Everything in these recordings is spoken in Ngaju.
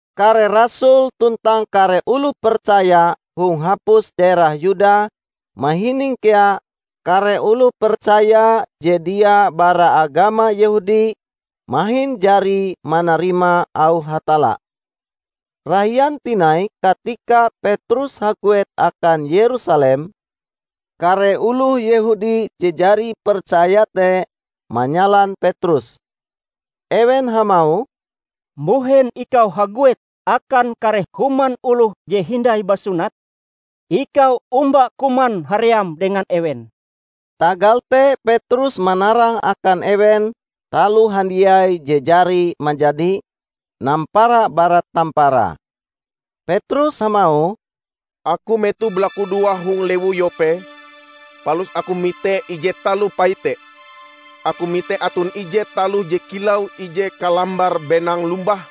Kare rasul tuntang kare oloh percaya hong hapus daerah Yuda mahining kea kare oloh percaya je dia bara agama Yehudi mahin jari manarima auh Hatalla. Rahian tinai katika Petrus haguet akan Yerusalem, kare oloh Yehudi je jari percaya te, manyalan Petrus. Ewen hamauh, "Mbuhen ikau haguet akan kare human oloh je hindai basunat? Ikau omba kuman haream dengan ewen!" Tagal te Petrus manarang akan ewen taloh handiai je jari manjadi, nampara bara tamparae. Petrus hamauh, "Aku metoh balakudoa hong lewu Yope, palus aku mite ije taloh paite. Aku mite aton ije taloh je kilau ije kalambar benang lombah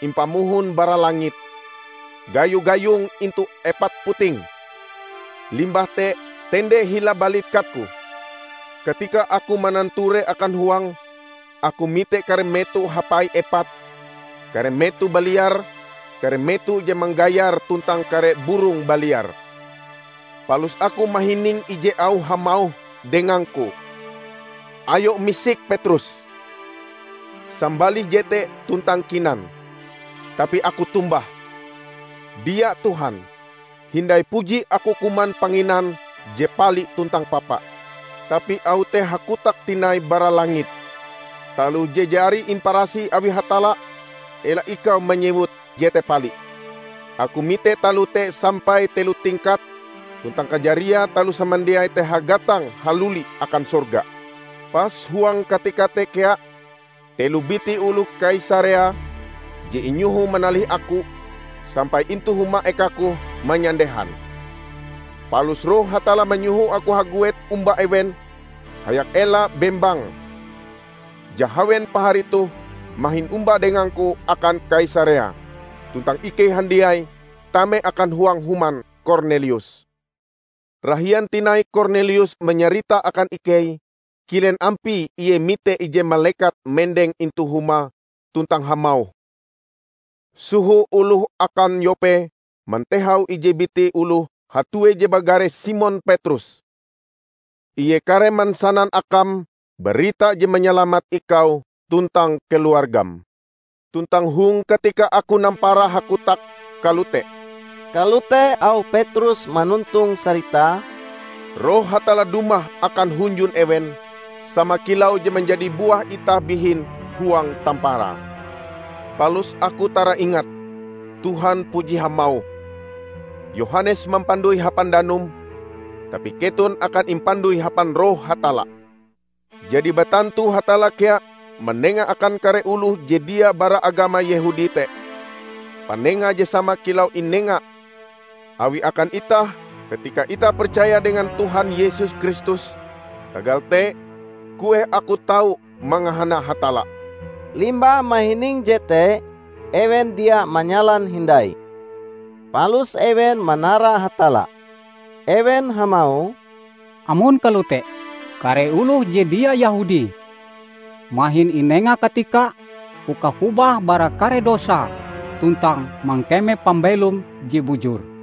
impamohon bara langit, gayo-gayong intu epat putinge, limbah te tende hila balikatku. Katika aku mananture akan huange, aku mite kare meto hapai epat, kare meto baliar, kare meto je manggayar tuntang kare burong baliar. Palus aku mahining ije auh hamauh dengangku, 'Ayo misik, Petrus! Sambalih jete tuntang kinan!' Tapi aku tombah, 'Dia, Tuhan! Hindai puji aku kuman panginan je pali tuntang papa.' Tapi auh te hakotak tinai bara langit, 'Taloh je jari imparasih awi Hatalla ela ikau manyewut jete pali.' Aku mite taloh te sampai telo tingkat tuntang kajariae taloh samandiai te hagatang haluli akan sorga. Pas huang katika te kea telo biti oloh Kaisarea, je inyoho manalih aku, sampai intu huma ekaku manyandehan. Palus Roh Hatalla manyoho aku haguet omba ewen hayak ela bembang. Jahawen pahari toh mahin omba dengangku akan Kaisarea, tuntang ikei handiai tame akan huang human Kornelius. Rahian tinai Kornelius manyarita akan ikei kilen ampie ie mite ije malekat mendeng intu humae tuntang hamauh, 'Soho oloh akan Yope mantehau ije biti oloh hatue je bagare Simon Petrus. Ie kareh mansanan akam barita je manyalamat ikau tuntang keluargam.' Tuntang hong katika aku nampara hakotak kalote," kalote auh Petrus manontong saritae, "Roh Hatalla dumah akan hunjun ewen, sama kilau je manjadi buah itah bihin huang tamparae. Palus aku taraingat, Tuhan puji hamauh, 'Yohanes mampandoi hapan danum, tapi keton akan impandoi hapan Roh Hatalla.' Jadi batantu Hatalla kea manenga akan kare oloh je dia bara agama Yehudi te, panenga je sama kilau inenga Awie akan itah katika itah percaya dengan Tuhan Yesus Kristus. Tagal te, kueh aku tau mangahana Hatalla!" Limbah mahining jete, ewen dia manyalan hindai. Palus ewen manara Hatalla. Ewen hamauh, "Amon kalote, kare oloh je dia Yehudi mahin inenga katika uka hobah bara kare dosae tuntang mangkeme pambelom je bujur!"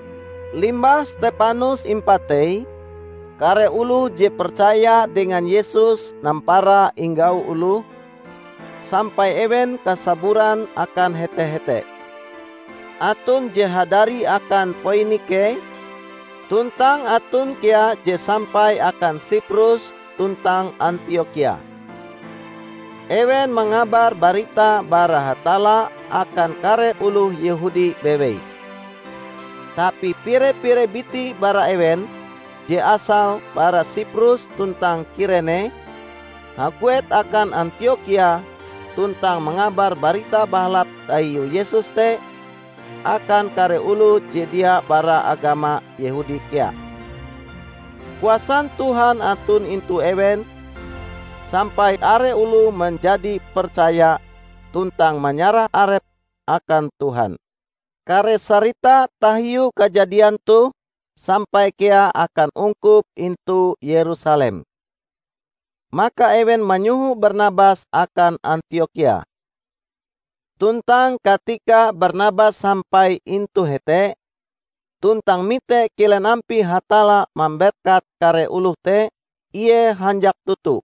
Limbah Stepanus impatei, kare oloh je percaya dengan Yesus nampara inggau oloh, sampai ewen kasaburan akan hete-hete. Aton je hadari akan Poinike, tuntang aton kea je sampai akan Siprus tuntang Antiokhia. Ewen mangabar barita bara Hatalla akan kare oloh Yehudi bewei. Tapi pire-pire biti bara ewen, je asale bara Siprus tuntang Kirene, haguet akan Antiokhia tuntang mangabar Barita Bahalap tahiu Yesus te akan kare oloh je dia bara agama Yehudi kea. Kuasan Tuhan aton intu ewen sampai are oloh manjadi percaya tuntang manyarah arepe akan Tuhan. Kare sarita tahiu kajadian toh sampai kea akan ungkup intu Yerusalem. Maka ewen manyoho Barnabas akan Antiokhia. Tuntang katika Barnabas sampai intu hete, tuntang mite kilen ampie Hatalla mamberkat kare oloh te, ie hanjak toto.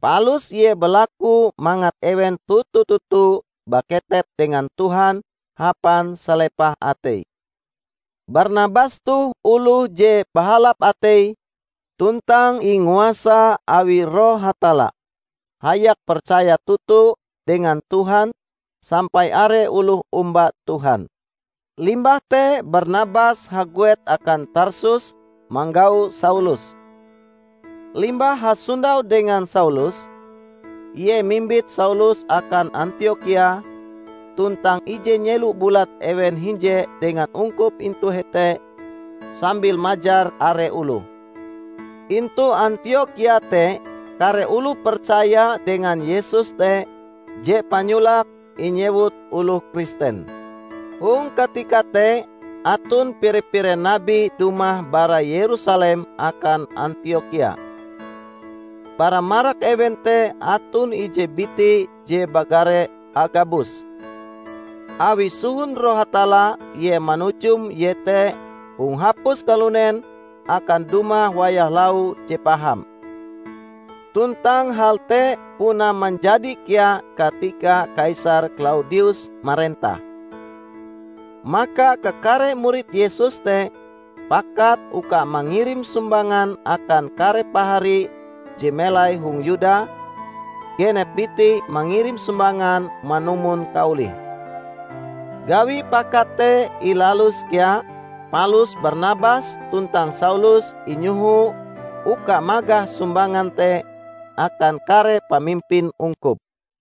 Palus ie balaku mangat ewen toto-toto baketep dengan Tuhan hapan salepah atei. Barnabas toh oloh je bahalap ateie tuntang inguasa awi Roh Hatalla hayak percaya toto dengan Tuhan sampai are oloh omba Tuhan. Limbah te Barnabas haguet akan Tarsus manggau Saulus. Limbah hasondau dengan Saulus, ie mimbit Saulus akan Antiokhia tuntang ije nyelo bulat ewen hinje dengan ungkup intu hete sambil majar are oloh. Intu Antiokhia te kare oloh percaya dengan Yesus te je panyolake inyewut oloh Kristen. Hong katika te aton pire-pire nabi dumah bara Yerusalem akan Antiokhia. Bara marak ewen te aton ije biti je bagare Agabus. Awi sohon Roh Hatalla ie manujum iete hong hapus kalunen akan dumah wayah lau je paham. (Tuntang hal te puna manjadi kea katika Kaisar Klaudius marentah.) Maka kakare murid Yesus te pakat uka mangirim sumbangan akan kare pahari je melai hong Yuda; genep biti mangirim sumbangan manumon kaolihe. Gawi pakat te ilalus kea, palus Barnabas tuntang Saulus inyoho uka magah sumbangan te akan kare pamimpin ungkup.